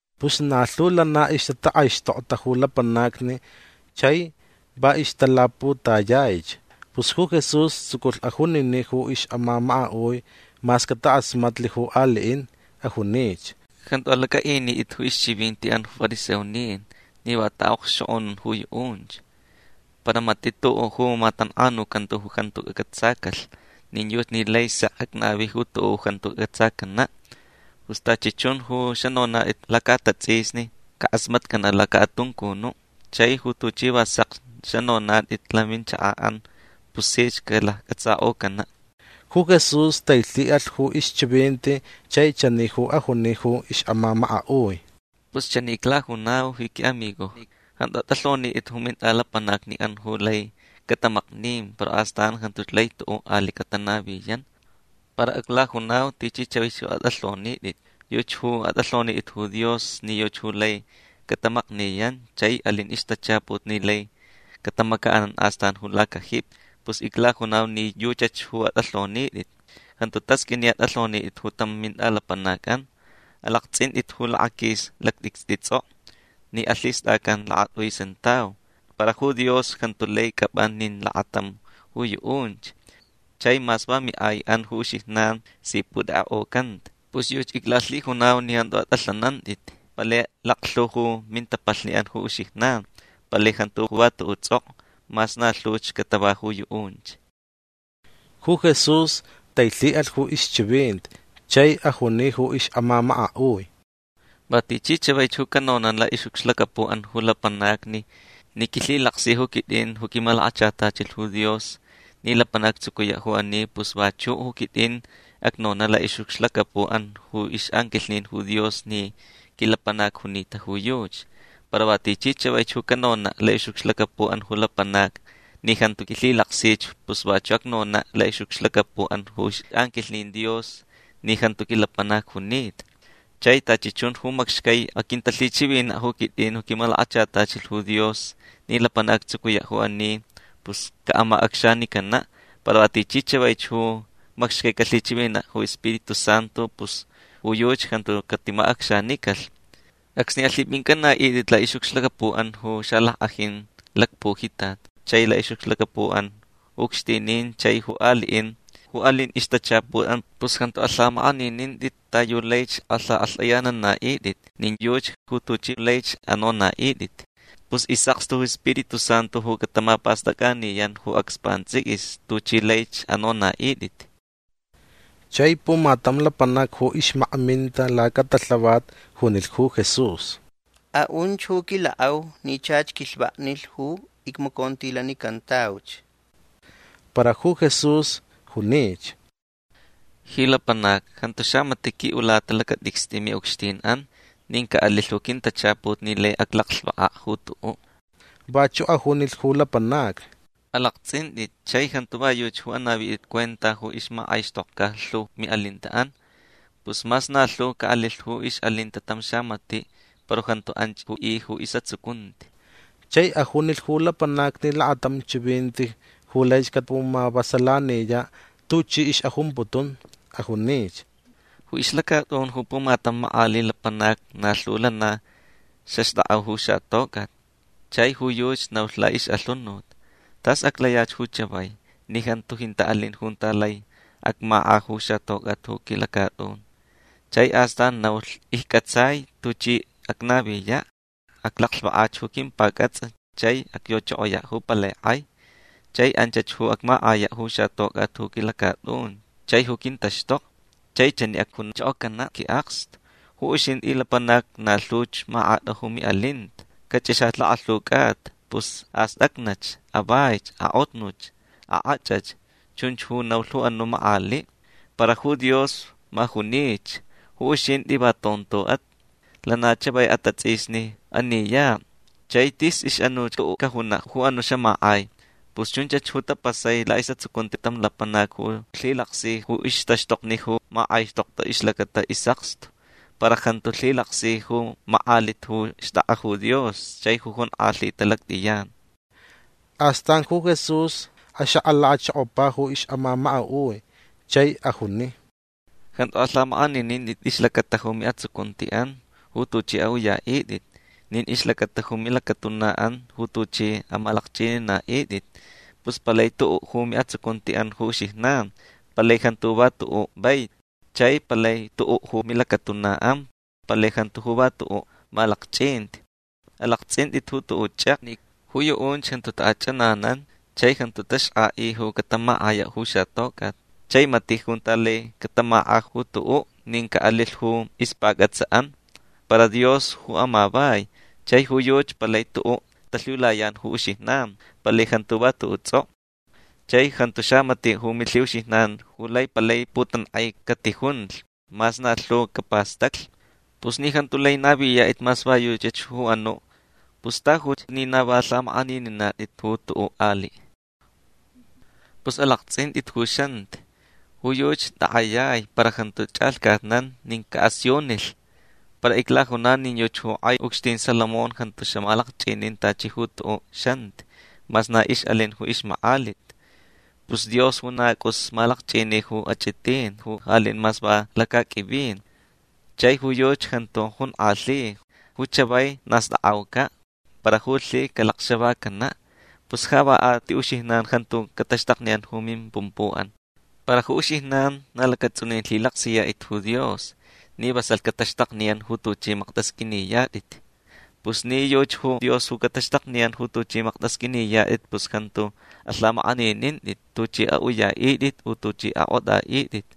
Pus na lhu lana ixtatakʼaixtokta ju lapanacni chai va ixtalaputayaich. Pus ju Jesús tsuculh ajuniniʼ ju ixʼamamakaʼui mas catakʼasmatlh ju aliʼin. Ajunich: ―Jantu alacʼaʼinitʼit ju ixchivintiʼan ju fariseonin ni va taʼaʼokxchokʼonun ju yuʼunch. Para matiʼ tuʼuʼ ju matankʼanucanta ju jantu cacʼatsacalh. Nin yuchi ni lai sek acnavi ju tuʼuʼ ju jantu cacʼatsacanaʼ. Pus tachi chun ju xanonatʼit lacaʼatatsʼisni cakʼasmatcanaʼ lacaʼatuncunuʼ. Chai ju tuchi va sekch xanonatʼit laminchakaʼan pus sich calaccʼatsakʼocanaʼ. Ju Jesús tailhiʼalh ju ixchivinti chai chani ju ajuni ju ixʼamamakaʼui: ―Pus chani iclajunau ji quiʼamigojni. Jantu atʼalhonitʼit ju mintʼalapanacniʼan ju lai catamaknin para astan jantuch lai tuʼuʼ aliʼ catanaviyan. Para aclajunau tichi chavaich ju atʼalhonitʼit. Yuchi ju atʼalhonitʼit ju Dios ni yuchi ju lai catamakniyan chai alin ixtachaput ni lai catamacaʼanan astan ju lacajipi. Pus iclajunau ni yuchach ju atʼalhonitʼit. Jantu tasqʼuini ni atʼalhonitʼit ju tam mintʼalapanacʼan. Alaktsʼintʼit ju lakaquis lactʼicstʼi tsʼokʼo ni lhistʼacan lakatʼui sentau. Para ju Dios jantu lai cʼapʼa nin lakatam ju yuʼunch. Chai mas va miʼaiʼan ju uxijnan si putekʼekʼocanta. Pus yuchi iclalhijunau ni jantu atʼalhanantʼit. Palai laklhu ju mintapalhniʼan ju uxijnan. Palai jantu ju va tuʼuʼ tsʼokʼo mas na lhuch catava ju yuʼunch. Ju Jesús tailhiʼalh ju ixchivinti chai ajuni ju ixʼamamakaʼui: ―Va tichi chavaich ju canonaʼ laʼixʼucxlacapuʼan ju lapanacni ni quilhilaksi ju quitʼin ju quimalakachatachilh ju Dios ni lapanac actsucuyaʼ ju ani pus vachuʼ ju quitʼin acnonaʼ laʼixʼucxlacapuʼan ju ixʼanquilhnin ju Dios ni quilapanac junita ju yuchi. Para va tichi chavaich ju canonaʼ laʼixʼucxlacapuʼan ju lapanacni ni jantu quilhilaksich pus vachuʼ acnonaʼ laʼixʼucxlacapuʼan ju ixʼanquilhnin Dios ni jantu quilapanac junita. Chai tachi chun ju macxcai aquintalhichivinaʼ ju quitʼin ju quimalakachatachilh ju Dios ni lapanac actsucuyaʼ ju ani pus caʼamacʼacxanicanaʼ. Para va tichi chavaich ju macxcai calhichivinaʼ ju Spiritu Santu pus ju yuchi jantu catimacʼacxanicalh. Acsni alhipʼincʼanaʼitʼit laʼixʼucxlacapuʼan ju xalackʼajin lacpujitat chai laʼixʼucxlacapuʼan ju ucxtinin chai ju aliʼin ju alin ixtachaputʼan pus jantu alhamakʼaninintʼit ta yu laich alhakʼalhtʼayananaʼitʼit nin yuchi ju tuchʼi laich anonaʼitʼit. Pus isʼakstu ju Spiritu Santu ju catamapastʼacʼaniyan ju acs pantsʼiquis tuchʼi laich anonaʼitʼit. Chai pumatam lapanac ju ixmakminta lacatalhavat junilh ju Jesús: ―Aʼunch ju quilakʼau ni chach quilhvaknilh ju icmacontilanicantauch. Para ju Jesús junich: ―Ji lapanac jantu xamatiʼ quiʼulata lacatʼicstʼi miʼucxtinʼan. Nin caʼalilh ju quintachaput ni lai aclaclhvakaʼ ju tuʼuʼ. Vachuʼ ajunilh ju lapanacni: ―Alaktsʼintʼit chai jantu va yuchi ju anavitʼit cuenta ju ixmakʼaixtʼokʼa lhu ju miʼalintaʼan. Pus mas na lhu caʼalilh ju ixʼalinta tam xamatiʼ para jantu anch ju i ju isʼatsucunti. Chai ajunilh ju lapanacni lakatam chivinti ju laich capumavasalaniyaʼ tuchi ixʼajumputun. Ajunich: ―Ju ixlacatʼun ju pumatam makʼaliʼ lapanac na lhu lana xaxtʼakʼa ju xatocʼat. Chai ju yuchi naulh laʼixʼalhunut: “Tas aclayach ju chavai ni jantu jintaʼ alin junta lai acmakʼa ju xatocʼat ju quilacatʼun”. Chai astan naulh: “Iccʼatsai tuchi acnaviyaʼ. Aclaclhvakach ju quimpacʼatsʼa chai acyochokoyaʼ ju palai kʼai. Chai anchach ju acmakʼayaʼ ju xatocʼat ju quilacatʼun chai ju quintaxtokni. Chai chani acjunchokocanaʼ quiʼakstu: Ju uxintʼi lapanac na lhuch makʼata ju miʼalinta. Cachʼixach lakalhu cʼata. Pus astʼacnach. Avaich. Akʼotnuch. Akʼachʼach”. Chunch ju naulh ju anuʼ makʼaliʼ. Para ju Dios ma junich: “Ju uxintʼi va tontoʼat. Lana chavai atatsʼisni aniyaʼ. Chai tis ixʼanuch cʼuʼu cajunaʼ ju anuʼ xamakʼai”. Pus chunch ju tapasai laʼisʼatsucunti tam lapanac ju lhilaksi ju ixtaxtokni ju makʼaixtokta ixlacata isʼakstu para jantu lhilaksi ju makʼalit ju xtʼakʼa ju Dios chai ju jonkʼalhita lactʼiyan. Astan ju Jesús axakʼalachokopa ju ixʼamamakaʼui chai ajuni: ―Jantu alhamakʼaninintʼit ixlacata ju miʼatsucuntiʼan ju tuchʼi aʼuyaʼitʼit. Nin ixlacata ju milacatunaʼan ju tuchʼi amalakchʼininaʼitʼit. Pus palai tuʼuʼ ju miʼatsucuntiʼan ju uxijnan. Palai jantu ju va tuʼuʼ vaiti. Chai palai tuʼuʼ ju milacatunaʼan. Palai jantu ju va tuʼuʼ malakchʼinti. Alaktsʼintʼit ju tuʼuʼ chʼekni. Ju yuʼunch jantu taʼachʼananan chai jantu taxkʼaʼi ju catamakʼayaʼ ju xatocʼat. Chai matiʼ junta lai catamakʼa ju tuʼuʼ nin caʼalilh ju ixpacʼatsʼaʼan. Para Dios ju amavai. Chai ju yuchi palai tuʼuʼ talhiulayan ju uxijnan. Palai jantu ju va tuʼuʼ tsʼokʼo. Chai jantu xamatiʼ ju milhiʼuxijnan ju lai palai putankʼai catijunlh mas na lhu capastaclh. Pus ni jantu lai naviyatʼit mas va yuchach ju anuʼ pus tajuch ni na va lhamakʼanininatʼit ju tuʼuʼ aliʼ. Pus alaktsʼintʼit ju xanti. Ju yuchi takʼayai para jantu chʼalhcatnan nin caʼasiunilh. Para iclajunau nin yuchi ju kʼai ucxtin Salomón jantu xamalakchʼinin tachi ju tuʼuʼ xanti mas na ixʼalin ju ixmakʼalit. Pus Dios ju na cʼus malakchʼini ju achʼitin ju alin mas va lacaqʼuivin. Chai ju yuchi jantu jonkʼalhi. Ju chavai na stakʼaucaʼ. Para ju lhi calacxavacanaʼ. Pus ja va a ti uxijnan jantu cataxtakniyan ju mimpumpuʼan. Para ju uxijnan na lacatsʼunin lhilaksiyatʼit ju Dios ni vasalh cataxtakniyan ju tuchʼi maktʼasqʼuiniyatʼit. Pus ni yuchi ju Dios ju cataxtakniyan ju tuchʼi maktʼasqʼuiniyatʼit pus jantu alhamakʼaninintʼit tuchʼi aʼuyaʼitʼit u tuchʼi akʼotʼaʼitʼit.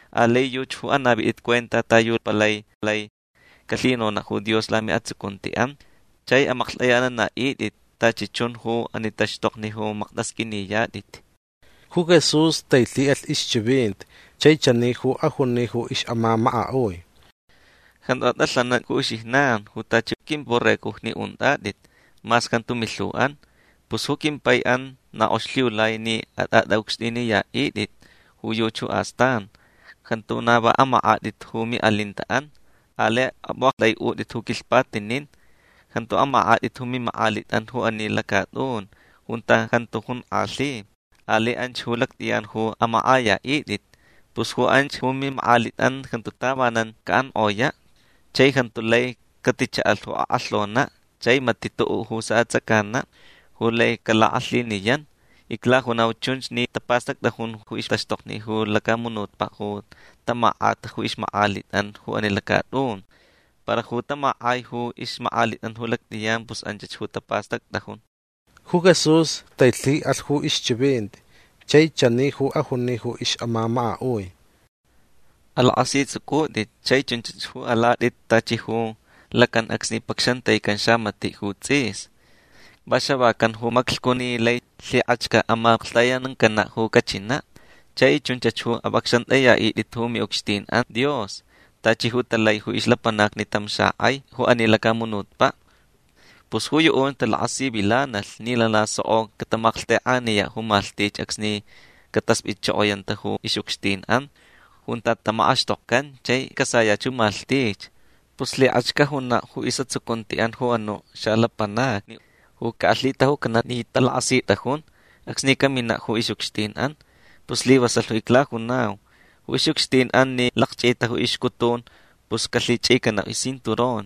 Alai yuchi ju anavitʼit cuenta ta yu palai lai calhinonaʼ ju Dios lamiʼatsucuntiʼan chai amaklhtʼayananaʼitʼit tachi chun ju ani taxtokni ju maktʼasqʼuiniyatʼit. Ju Jesús tailhiʼalh ixchivinti chai chani ju ajuni ju ixʼamamakaʼui: ―Jantu atʼalhanantʼit ju uxijnan ju tachi quimborregojni untʼatʼit mas jantu milhuʼan. Pus ju quimpai na kʼox lhiulai ni atʼatʼaʼucxtʼiniyaʼitʼit ju yuchi astan. Jantu na va amakʼatʼit ju miʼalintaʼan. Alai apʼuʼaktʼaiʼutʼit ju quilhpatinin. Jantu amakʼatʼit ju mimakʼalitʼan ju ani lacatʼun junta jantu jonkʼalhi. Alai anch ju lactʼiyan ju amakʼayaʼitʼit. Pus ju anch ju mimakʼalitʼan jantu tavanan caʼankʼoyaʼ. Chai jantu lai catichaʼalh ju akʼalhonaʼ. Chai matiʼ tuʼuʼ ju saʼatsʼacanaʼ ju lai calakʼalhiniyan. Iclajunau chunch ni tapastactʼajun ju ixtaxtokni ju lacamunutpaʼ ju tamakʼata ju ixmakʼalitʼan ju ani lacatʼun. Para ju tamakʼai ju ixmakʼalitʼan ju lactʼiyan pus anchach ju tapastactʼajun. Ju Jesús tailhiʼalh ju ixchivinti chai chani ju ajuni ju ixʼamamakaʼui: ―Alakʼasitsʼucʼutʼit chai chunch ju alatʼit tachi ju lacan acsni pacxantaican xamatiʼ ju tsʼis. Va xavacan ju maclhcu ni lai lhikʼach caʼamaklhtayanancanaʼ ju cachinaʼ. Chai chunchach ju apʼacxantʼayaʼitʼit ju miʼucxtinʼan Dios tachi ju talai ju ixlapanacni tam xakʼai ju ani lacamunutpaʼ. Pus ju yuʼunch talakasivilanalh ni lana soko catamalhtekʼaniyaʼ ju malhtich acsni cataspʼitchokoyanta ju ixʼucxtinʼan junta tamakʼaxtokcan chai casayach ju malhtich. Pus lhikʼach cajunaʼ ju isʼatsucuntiʼan ju anuʼ xalapanacni ju caʼalhitajucanaʼ ni talakʼasitʼajun acsni caminaʼ ju ixʼucxtinʼan. Pus islivasalh ju iclajunau. Ju ixʼucxtinʼan ni lakchʼita ju ixcutun pus calhichʼicanaʼ iscinturon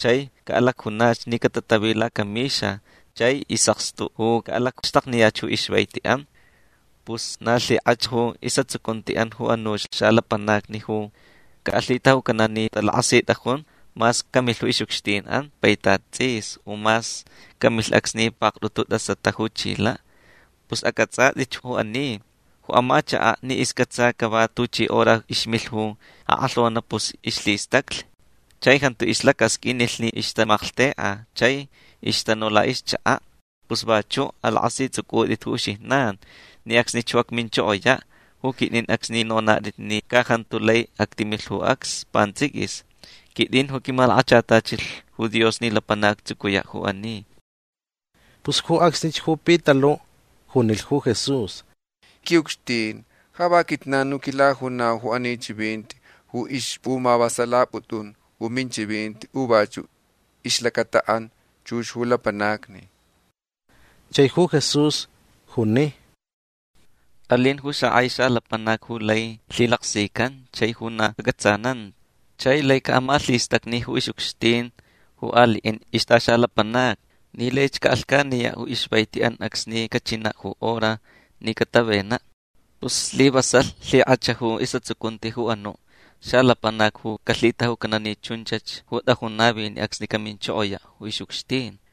chai caʼalacjunach ni catatavi lacamixa chai isʼakstu ju caʼalacxtakniyach ju ixvaitiʼan. Pus na lhikʼach ju isʼatsucuntiʼan ju anuch xalapanacni ju caʼalhitajucanaʼ ni talakʼasitʼajun mas camilh ju ixʼucxtinʼan ju paitat tsʼis u mas camilh acsni paktʼutu tʼasata ju chilaʼ. Pus acʼatsʼatʼitch ju ani. Ju amachakaʼ ni iscʼatsa cava tuchi hora ixmilh ju akʼalhonaʼ pus ixlhistaclh chai jantu ixlacasqʼuinilh ni ixtamalhtekʼa chai ixtanu laʼixchakaʼ. Pus vachuʼ alakʼasitsʼucʼutʼit ju uxijnan ni acsnich ju acminchokoyaʼ ju quitʼin acsni nonatʼit ni ca jantu lai actimilh ju acs pantsʼiquis. Quitʼin ju quimalakachatachilh ju Dios ni lapanac actsucuyaʼ ju ani. Pus ju acsnich ju Pitaluʼ junilh ju Jesús: ―Quiʼucxtin ja va quijnan ju quilajunau ju ani chivinti ju ixpʼumavasalapʼutʼun ju minchivinti u vachuʼ ixlacataʼan chux ju lapanacni. Chai ju Jesús juni: ―Alin ju xakʼai xalapanac ju lai lhilaksican chai ju na acʼatsananta chai lai caʼamalhistacni ju ixʼucxtin ju aliʼin ixtʼaxalapanacni ni laich caʼalhcaniyaʼ ju ixvaitiʼan acsni cachinaʼ ju hora ni catavenaʼ. Pus slivasalh lhikʼach ju isʼatsucunti ju anuʼ xalapanac ju calhitajucanaʼ ni chunchach ju tʼajun naviniʼ acsni caminchokoyaʼ ju ixʼucxtin.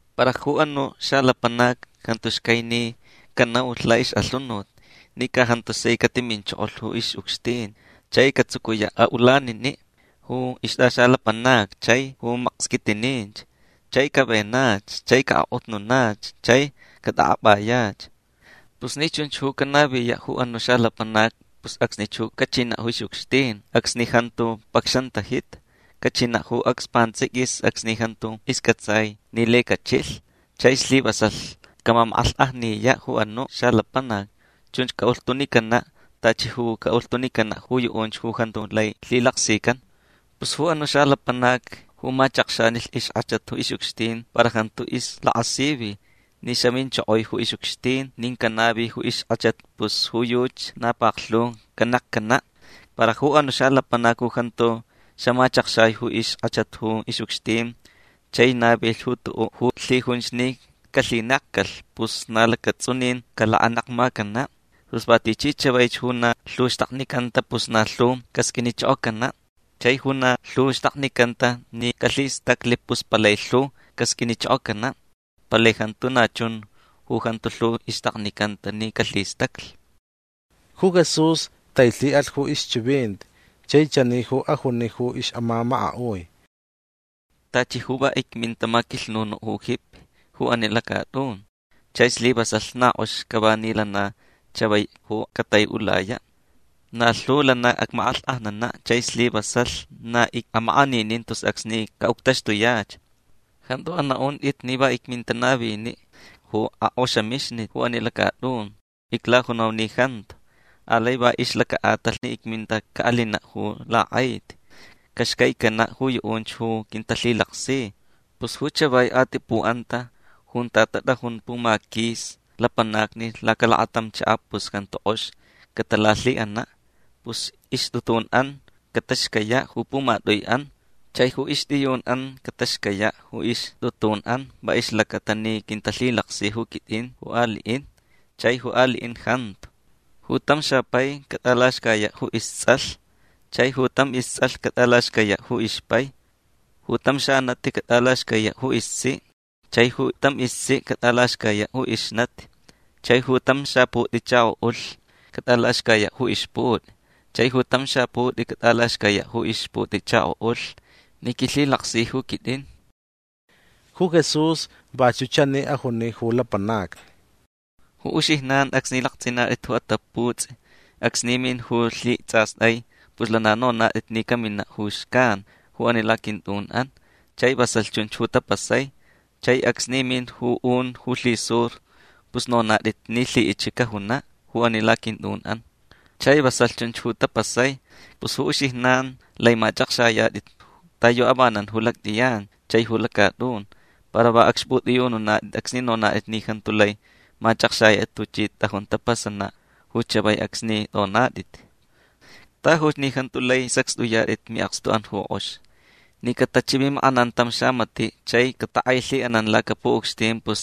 Para ju anuʼ xalapanac jantu xcai ni canaulh laʼixʼalhunut ni ca jantu sai catiminchokolh ju ixʼucxtin chai catsucuyaʼ aʼulaniniʼ ju ixtʼaxalapanacni chai ju maksquitininch. Chai cavenach chai caʼakʼotnanach chai catʼakʼapʼayach. Pus ni chunch ju canaviyaʼ ju anuʼ xalapanac pus acsnich ju cachinaʼ ju ixʼucxtin acsni jantu pacxantajita. Cachinaʼ ju acs pantsʼiquis acsni jantu iscʼatsai ni lai cachilh. Chai slivasalh camamakʼalhkʼajniyaʼ ju anuʼ xalapanac. Chunch caʼulhtunicanaʼ tachi ju caʼulhtunicanaʼ ju yuʼunch ju jantu lai lhilaksican. Pus ju anuʼ xalapanac ju machakxanilh ixkʼachat ju ixʼucxtin para jantu ixlakasivi ni xaminchokoi ju ixʼucxtin nin canavi ju ixkʼachat pus ju yuchi na paklhu canekcanaʼ. Para ju anuʼ xalapanac ju jantu xamachakxai ju ixkʼachat ju ixʼucxtin chai navilh ju tuʼuʼ ju lhijunch ni calhinekcalh pus na lacatsʼunin calakanekmacanaʼ. Pus va tichi chavaich ju na lhu xtaknicanta pus na lhu casqʼuinichokocanaʼ. Chai ju na lhu xtaknicanta ni calhistaclh pus palai lhu casqʼuinichokocanaʼ. Palai jantu na chun ju jantu lhu ixtaknicanta ni calhistaclh. Ju Jesús tailhiʼalh ju ixchivinti chai chani ju ajuni ju ixʼamamakaʼui: ―Tachi ju va icminta maquilhnunuʼ ju jipi ju ani lacatʼun. Chai slivasalh na kʼox cava ni lana chavai ju cataiʼulayaʼ. Na lhu lana acmakʼalhkʼajnanaʼ chai slivasalh na icʼamakʼaninin tus acsni caʼuctaxtuyach. Jantu anaʼuntʼit ni va icminta naviniʼ ju akʼoxamixnit ju ani lacatʼun. Iclajunau ni jantu. Alai va ixlacaʼatalh ni icminta caʼalinaʼ ju lakʼaiti. Caxcaicanaʼ ju yuʼunch ju quintalhilaksi. Pus ju chavai atipuʼanta junta tatʼajun pumaquis lapanacni lacalakatam chakaʼ pus jantu kʼox catalalhiʼanaʼ. Pus ixtʼutunʼan cataxcayaʼ ju pumatʼuiʼan. Chai ju ixtʼiyunʼan cataxcayaʼ ju ixtʼutunʼan va ixlacata ni quintalhilaksi ju quitʼin ju aliʼin chai ju aliʼin jantu. Ju tam xapai catʼalaxcayaʼ ju istsʼalh. Chai ju tam istsʼalh catʼalaxcayaʼ ju ixpai. Ju tam xanati catʼalaxcayaʼ ju istsiʼ. Chai ju tam istsiʼ catʼalaxcayaʼ ju ixnati. Chai ju tam xaputʼichakoʼulh catʼalaxcayaʼ ju ixputʼi. Chai ju tam xaputʼi catʼalaxcayaʼ ju ixputʼichakoʼulh ni quilhilaksi ju quitʼin. Ju Jesús vachuʼ chani ajuni ju lapanacni: ―Ju uxijnan acsni laktsʼinatʼit ju ataputsʼi acsni min ju lhitsʼastʼai pus lana nonatʼit ni caminach ju xcan ju ani laquintʼunʼan. Chai vasalh chunch ju tapasai. Chai acsni min ju un ju lhisur pus nonatʼit ni lhiʼich cajunaʼ ju ani laquintʼunʼan. Chai vasalh chunch ju tapasai. Pus ju uxijnan lai machʼakxayatʼit ta yu avanan ju lactʼiyan chai ju lacatʼun. Para va acxpʼutʼiyununatʼit acsni nonatʼit ni jantu lai machʼakxayatʼit tuchi tʼajun tapasanaʼ ju chavai acsni tʼonatʼit. Tajuch ni jantu lai sacxtʼuyatʼit miʼakstuʼan ju kʼox. Ni catachivimakʼanan tam xamatiʼ chai catakʼailhiʼanan lacapuʼucxtin pus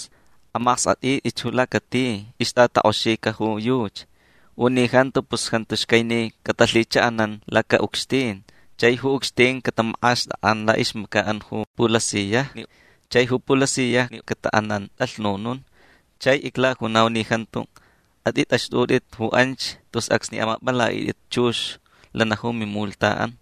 amaskʼatʼitʼitch ju lacati ixtʼatakʼoxica ju yuchi. U ni jantu pus jantu xcai ni catalhichaʼanan lacaʼucxtin. Chai ju ucxtin catamakʼaxtakʼan laʼixmacaʼan ju pulasiyajni. Chai ju pulasiyajni cataʼanan tʼalhnunun. Chai iclajunau ni jantu atʼitʼaxtʼutʼit ju anch tus acsni amapʼalaʼitʼit chux lana ju mimulhtaʼan.